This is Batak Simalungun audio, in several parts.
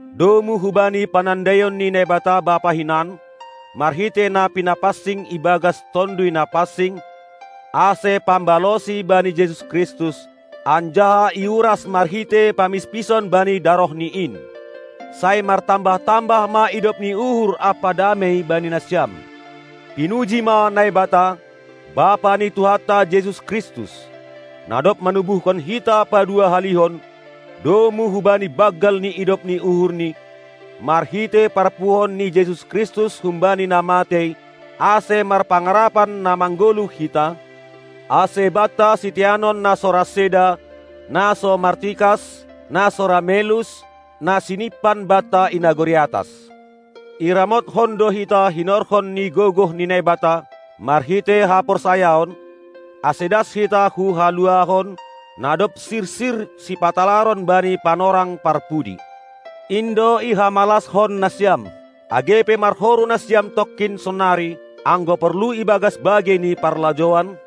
domu hubani panandaion ni Naibata Bapa hinan, marhitei na pinapansing ibagas Tonduy Napansing, ase pambalosi bani Jesus Kristus, anjaha iuras marhitei pamispison bani darohNi in. Sai martambah-tambah ma idop ni uhur ampa damei bani nasiam. Pinuji ma Naibata, Bapa ni Tuhanta Jesus Kristus, na dob manubuhkon hita paduahalihon, domu hubani banggal ni idop ni uhurni, marhitei parpuhoon ni Jesus Kristus humbani na matei, ase marpangarapan na manggoluh hita, ase banta siteanon na so ra seda, na so martikas, na so ra melus, na sinimpan banta i nagori atas. Iramotkon do hita hinorhon ni gogoh ni Naibata, marhitei haporsayaon, ase das hita hu haluahon, na dob sirsir sipatalaron bani panorang parpudi. In do ihamalashon nasiam, age pe marhoru nasiam tongkin sonari, anggo porlu ibagas bagei ni parlajouan,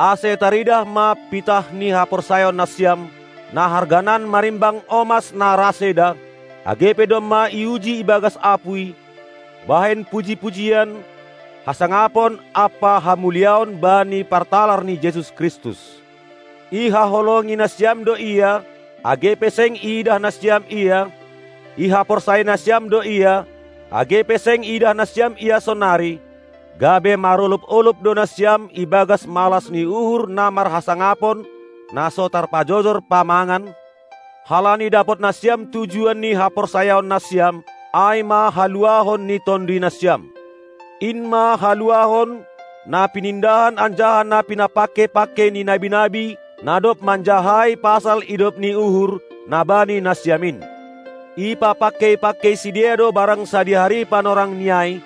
ase taridah ma pitah ni haporsayaon nasiam, na harganan marimbang omas na ra seda, age pe domma iuji ibagas apuy, bahen puji-pujian, hasangapon ampa hamuliaon bani partalar ni Jesus Kristus. Ihaholongi nasiam do Ia, age pe seng iidah nasiam Ia; ihaporsayai nasiam do Ia, age pe seng iidah nasiam Ia sonari, gabe marolob-olob do nasiam ibagas malas ni uhur na marhasangapon, na so tarpajojor pamangan, halani dapot nasiam tujuan ni haporsayaon nasiam, ai ma haluahon ni tonduy nasiam. In ma haluahon, na pinindahan anjaha na pinapangkei-pangkei ni nabi-nabi, na dob manjahai pasal idop ni uhur, na bani nasiam in. Ipapangkei-pangkei sidea do barang sadihari panorangni ai,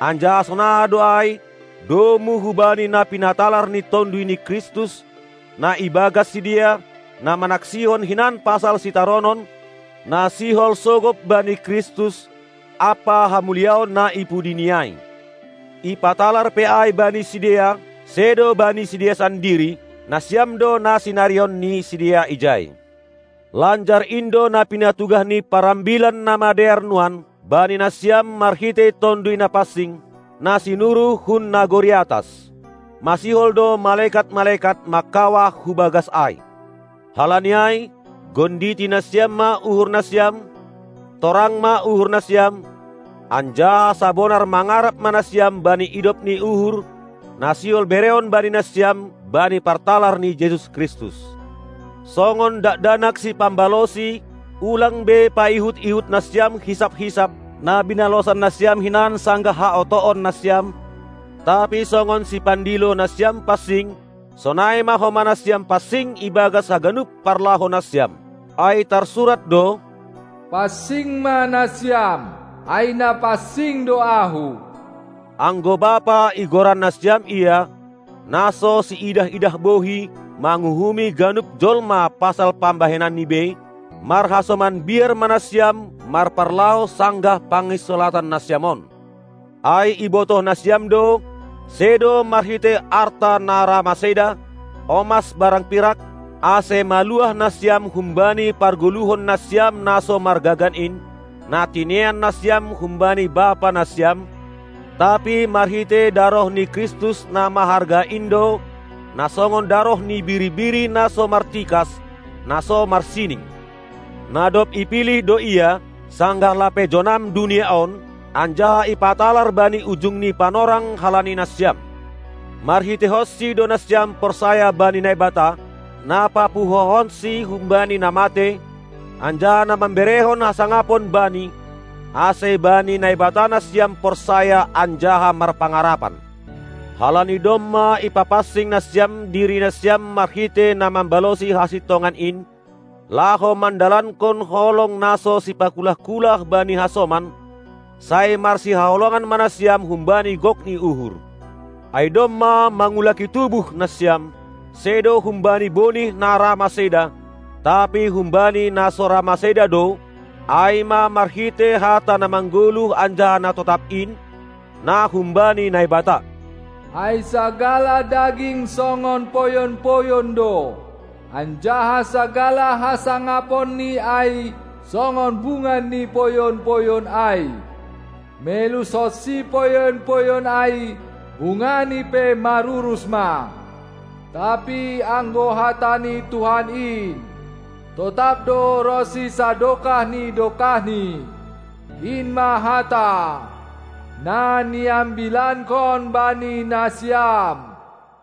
anjaha sonaha do ai, domu hubani na pinatalar ni Tonduy ni Kristus, na ibagas sidea, na manaksihon hinan pasal sitaronon, na sihol sogop bani Kristus, ampa hamuliaon na i pudi ni ai. Ipatalar pe ai bani sidea, sedo bani sidea sandiri, nasiam do na sinarihon ni sidea ijai. Lanjar in do na pinatugah ni par Ambilan Namadear nuan bani nasiam marhitei Tonduy Napansing, na sinuruh hun nagori atas. Masihol do malekat-malekat mangkawah hu bagas ai. Halani ai, gonditi nasiam ma uhur nasiam; torang ma uhur nasiam, anjaha sabonar mangarap ma nasiam bani idop ni uhur, na sihol bereon bani nasiam bani partalar ni Jesus Kristus. Songon dakdanak sipambalosi, ulang be paihut-ihut nasiam hisap-hisap, na binalosan nasiam hinan sanggah haotoon nasiam, tapi songon Sipandilo nasiam pansing, sonai ma homa nasiam pansing ibagas haganup parlahou nasiam. Ai tarsurat do: Pansing ma nasiam, ai na pansing do Ahu! Anggo Bapa igoran nasiam Ia, na so siidah-idah bohi manguhumi ganup jolma pasal pambahenanni bei, marhasoman biar ma nasiam marparlahou sanggah panginsolatan nasiam on. Ai ibotoh nasiam do: Sedo marhitei arta na ra maseda, omas barang pirak, ase maluah nasiam humbani pargoluhon nasiam na so margagan in, na tinean nasiam humbani bapa nasiam, tapi marhitei daroh ni Kristus na maharga in do, na songon daroh ni biri-biri na so martikas, na so marsining. Na dob ipilih do Ia, sanggah lape jonam dunia on, anjaha ipatalar bani ujung ni panorang halani nasiam. MarhiteihonSi do nasiam porsaya bani Naibata, na papuhohonSi humbani na matei, anjaha na mamberehon hasangapon Bani, ase bani Naibata nasiam porsaya anjaha marpangarapan. Halani domma ipapansing nasiam diri nasiam marhitei na mambalosi hasintongan in, laho mandalankon holong na so sipakulah-kulah bani hasoman, sai marsihaholongan ma nasiam humbani gok ni uhur. Ai domma mangulaki tubuh nasiam, sedo humbani bonih na ra maseda, tapi humbani na so ra maseda do, ai ma marhitei hata na manggoluh anjaha na totap in, na humbani Naibata. Ai sagala daging songon poyon-poyon do, anjaha sagala hasangaponni ai songon bunga ni poyon-poyon ai. Melushonsi poyon-poyon ai, bungani pe marurus ma. Tapi anggo hata ni Tuhan in, totap do ronsi sadokah ni dokahni. In ma hata, na niambilankon bani nasiam.